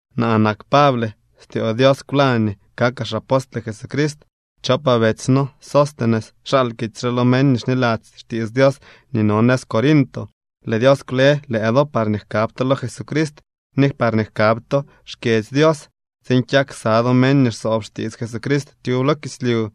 Naa nak Pable, styoo Dios kwlañ nii kakaa xapostle Jesucrist. Chopaa betsy no Sóstenes xal kitsy re lo meñ nii xniladzy xtiits Dios nii no nëz Corinto. Lëë Dios kwle lëë do parñee jkab to lo Jesucrist ni parñee jkab to xkyedzy Dios tsiin kyak ksa do meñ nii xsoob xtiits Jesucrist tyub lo kislyu.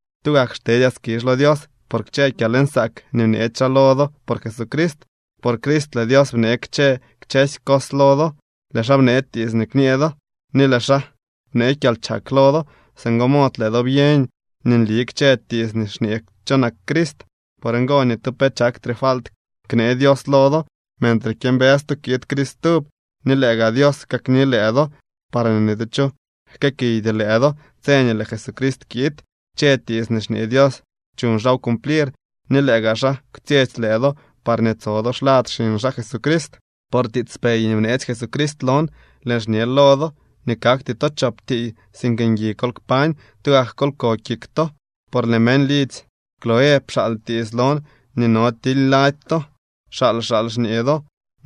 Tugak xtedyaa skizh lo Dios por kchë kyalnsaak nii bneetsy xaa lo do por Jesucrist. Por Crist lëë Dios bnee kchë kchësy cos lo do. Lëë xaa bnee tiits nii kñee do ni lëë xaa bnee kyalchak lo do. Singo mod lëë do byeñ nii nli kchë tiits nii xñee cho nak Crist. Por ngo, ni tu pe chaktre falt knee Dios lo do, mentre kyëmbës to kiid Crist stub. Ni lëë gaa Dios kakni lëë do, parñee ni tu cho jkëëkiydy lëë do tse nii lëë Jesucrist kiid. Kchë tiits nii xñee Dios chuñ xaaw cumplir ni lëë gaa xaa kwtsyetsy lëë do parñee tso do xlad xiñ xaa Jesucrist. Por tiitspey nii bneetsy Jesucrist lon lëën xñe lo do nii kakty to chop tiiy. Sink ngui kol kpañ, tugak kol ko kik to. Por lëë meñ lidzy Cloé pxaal tiits lon nii no tily lady to. Xaal xaal xñee do,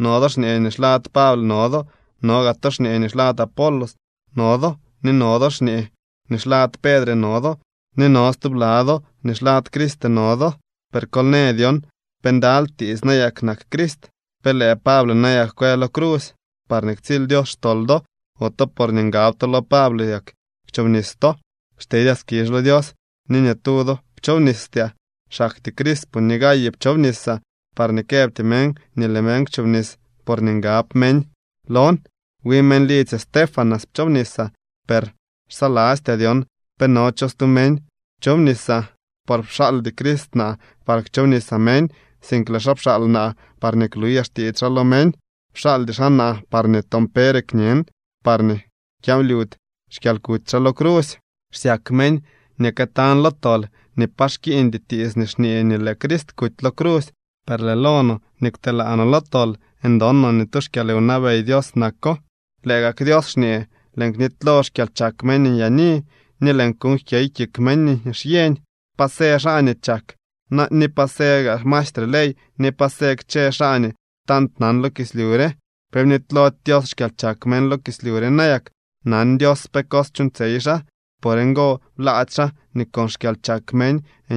no do xñee nii xlad Pable no do, no gaa to xñee nii xlad Apolos no do, ni no do xñee nii xlad Pedre no do ni no stubla do nii xlad Crist no do. Per kol në dyon pe ndaly tiiy nayak nak Crist. ¿Pe lëë Pable nayak kwë lo crusy parñee ktsily Dios xtol do? ¿Ote porñee ngab to lo Pable yak kwchobnis to? Xtedyaa skizh lo Dios nii ni tu do pchoobnistyaa, xaktyee Crispo ni Gayo pchoobnisaa, parñee këbty meñ nii lëë meñ kwchobnis porñee ngab meñ lon. Wi meñ lidzy Estéfanas pchoobnisaa, per xsalastyaa dyon pe no cho stu meñ pchoobnisaa. Por pxaaldy Crist naa par kchoobnisaa meñ, sink lëë xaa pxaal naa parñee kluyaa xtiits xaa lo meñ, pxaaldy xaa naa parñee toon pere kñen, parñee kyanlyudy xkyalkuty xaa lo crusy. Xsyak meñ nii këtañ lo tol nii pa xkiiñdy tiits nii xñee nii lëë Crist kuty lo crusy, per lëë lo no nii kwtelaa no lo tol ndon no nii tu xkyalwnabey Dios nak. Lëë gak Dios xñee: Lëën knitylo xkyalchak meñ nyaani, ni lëën kuuñ jkyey kik meñ nii xyeñ. ¿Pa së xaa nii chak na ni pa sëë gaa maestre ley ni pa së kchë xaa nii tant nan lo kislyu re? ¿Pe bnitylody Dios xkyalchak meñ lo kislyu re nayak? Nan Dios pe cos chuuñtsyey xaa. Por ngo blaady xaa nii con xkyalchak meñ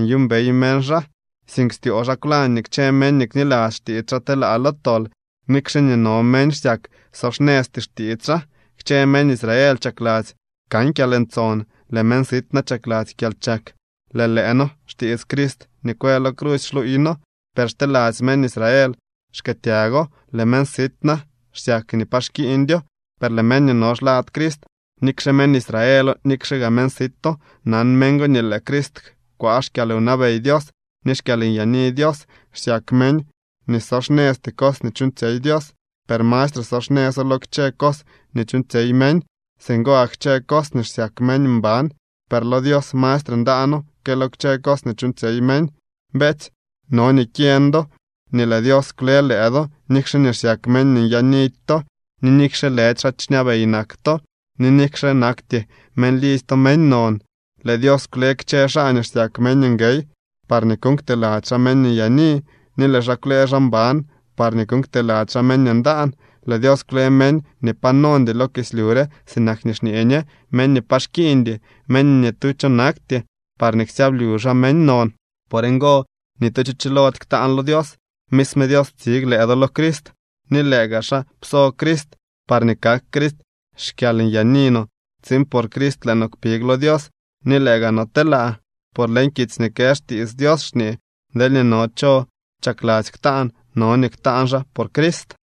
nyuumbey meñ xaa, sink styoo xaa kwlañ nii kchë meñ nii kniladzy xtiits xaa telaa lo tol, nikxe nii no meñ xsyak so xnëzty xtiits xaa. Kchë meñ Israel chakladzy kan kyalntson, lëë meñ sit na chakladzy kyalchak. Lëë lëë noo xtiits Crist nii kwë lo crusy xluuy noo, per xteladzy meñ Israel xkëëtyago. Lëë meñ sit na xsyak nii pa xkiiñdyo, per lëë meñ nii no xlad Crist, nikxe meñ Israelo, nikxe gaa meñ sito, nan meñ go nii lëë Crist kwaa xkyalwnabey Dios ni xkyalnyaani Dios. Xsyak meñ nii so xnëzty cos nii chuuñtsyey Dios, per mastre so xnëzo lo kchë cos nii chuuñtsyey meñ. Singo gak kchë cos nii xsyak meñ mban, per lo Dios mastre ndaano que lo kchë cos nii chuuñtsyey meñ. Beetsy, no nii kyeñ do nii lëë Dios kwle lëë do, nikxe nii xsyak meñ nii nyaanidy to, ni nikxe lëdy xaa xñabey nak to, ni nikxe nakty meñ lidzy to meñ non. Lëë Dios kwle kchë xaa nii xsyak meñ nguey parñee kuuñ kteladzy xaa meñ nyaani, ni lëë xaa kwle xaa mban parñee kuuñ kteladzy xaa meñ ndaan. Lëë Dios kwle meñ nii pa nondy lo kislyu re sinak nii xñee ñe meñ nii pa xkiiñdy, meñ nii ni tu cho nakty, parñee ksyablyu xaa meñ non. Por ngo ni tu cho chilody ktaan lo Dios. Misme Dios ptsig lëë do lo Crist, ni lëë gaa xaa pso Crist parñee kak Crist xkyalnyaani no tsiin por Crist lëë noo kpig lo Dios ni lëë gaa no telaa. Por leñ kitsy nii kë xtiits Dios xñee: “Deelñee no cho chakladzy ktaan, no nii ktaan xaa por Crist.”